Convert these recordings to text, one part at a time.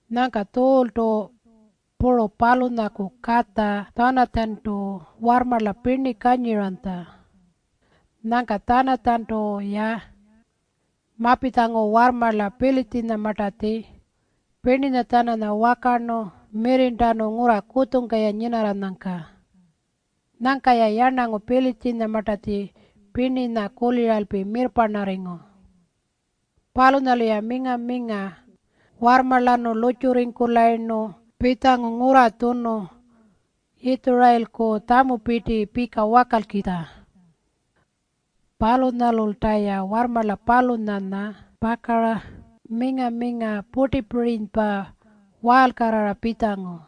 Nyangka Tjuultu puru palunyaku katja Tjanatjantu warrmarla pirni kanyiranytja. Nyangka Tjanatjantu-ya mapitjangu warrmarla Pilitjinyamartatji pirninya-tjananya wakarnu mirrirntanu ngurra kutjungka-ya nyinarranyangka. Nyangka-ya yarnangu Pilitjinyamartatji pirninya kuliralpi mirrparnarringu. Palunyalu-ya minga-minga warrmarlanu lurrtjurringkulayirnu pitjangu ngurra tjunu Yitjurayilku tjamupirti pika wakalkitja. Palunyalulta-ya warrmarla palunyanya pakara minga-minga purtipirinypa waalkarrara pitjangu.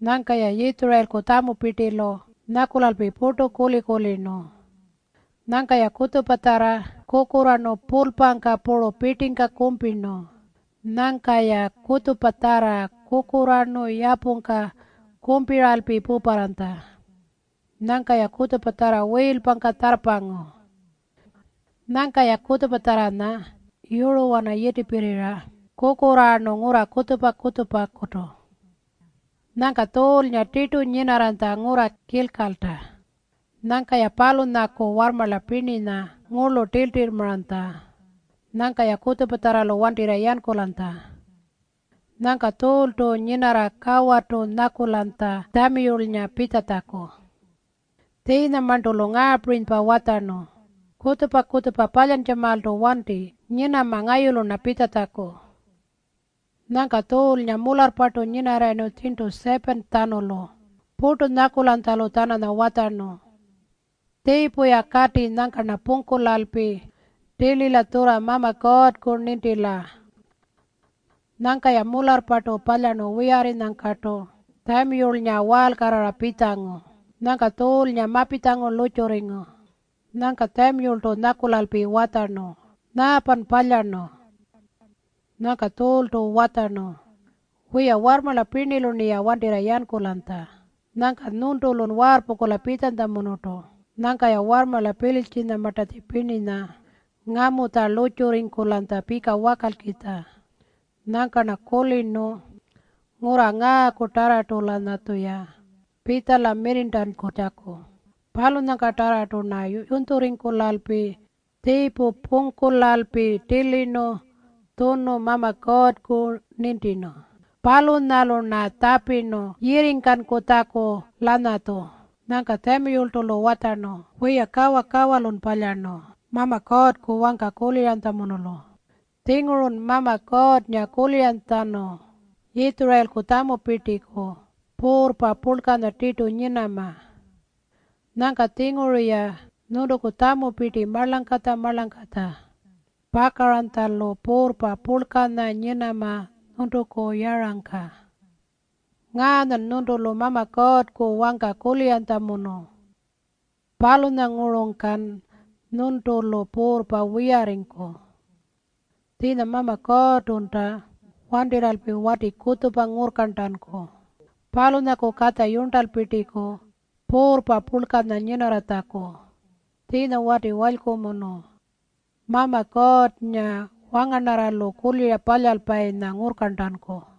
Nyangka-ya Yitjurayilku tjamupirtilu nyakulalpi purtu kuli-kulirnu. Nyangka-ya kutjupatjarra kukurraarnu pulpangka puru pirtingka kumpirnu. Nyangka-ya kutjupatjarra kukurraarnu yapungka kumpiralpi puparranytja. Nyangka-ya kutjupatjarra wiilpangka tjarrpangu. Nyangka-ya kutjupatjarranya yuruwana yitipirrirra kukurraarnu ngurra kutjupa-kutjupakutu. Nyangka Tjuulnga tirtu nyinarranytja ngurra Kilkalta. Nyangka-ya palunyaku warrmarla pirninya ngurlu tiltirrmaranytja. Nyangka-ya kutjupatjarralu wantirra yankulanytja. Nyangka Tjuultu nyinarra kawarrtu nyakulanytja Tjamiyulnga pitjatjaku. Tjiinyamarntu-lu ngaapirinypa watjarnu, “Kutjupa-kutjupa palyantjamaaltu wanti. Nyinama ngayulu-rna pitjatjaku.” Nyangka Tjuulnga mularrpartu nyinarrayirnu tjirntu 7-tjanulu purtu nyakulanytjalu-tjananya watjarnu, “Tjiipu-ya kati nyangka-rna pungkulalpi tilila tjurra Mama Kuurrku nintila.” Nyangka-ya mularrpartu palyarnu wiyarrinyangkartu Tjamiyulnga waalkarrara pitjangu. Nyangka Tjuulnga mapitjangu lurrtjurringu. Nyangka Tjamiyultu nyakulalpi watjarnu, “Nyaapan palyarnu?” Nyangka Tjuultu watjarnu, “Wiya, warrmarla pirnilu-rniya wantirra yankulanytja. Nyangka nyuntulun waarrpungkula pitjanytjamunurtu. Nyangka-ya warrmarla Pilitjinyamartatji pirninya ngamutja lurrtjurringkulanytja pika wakalkitja. Nyangka-rna kulirnu ngurra ngaakutarrartu-lanyatjuya pitjala mirrirntankutjaku. Palunyangkatarrartu-rna yunytjurringkulalpi tjiipu pungkulalpi tilirnu tjunu Mama Kuurrku nintirnu. Palunyalu-rna tjapirnu yirringkankutjaku-lanyatju.” Nyangka Tjamiyultu-lu watjarnu, “Wiya, kawa-kawalun palyarnu Mama Kuurrku wangka kuliranytjamunulu. Tjingurun Mama Kuurrnga kuliranytjatjanu Yitjurayilku tjamupirtiku puurrpa purlkanya tirtu nyinama. Nyangka-tjinguru-ya nyuntuku tjamupirti marlangkatja-marlangkatja pakaranytjalu puurrpa purlkanya nyinama nyuntuku yarangka. Ngaanyan nyuntulu Mama Kuurrku wangka kuliranytjamunu. Palunyangurungkan nyuntulu puurrpa wiyarringku. Tjiinya Mama Kuurrtunta wantirralpi wati kutjupa ngurrkarntanku palunyaku katja yurntalpirtiku puurrpa purlkanya nyinarratjaku. Tjiinya wati walykumunu, Mama Kuurrnga wangarnarralu kulira palyalpayinya ngurrkarntanku.”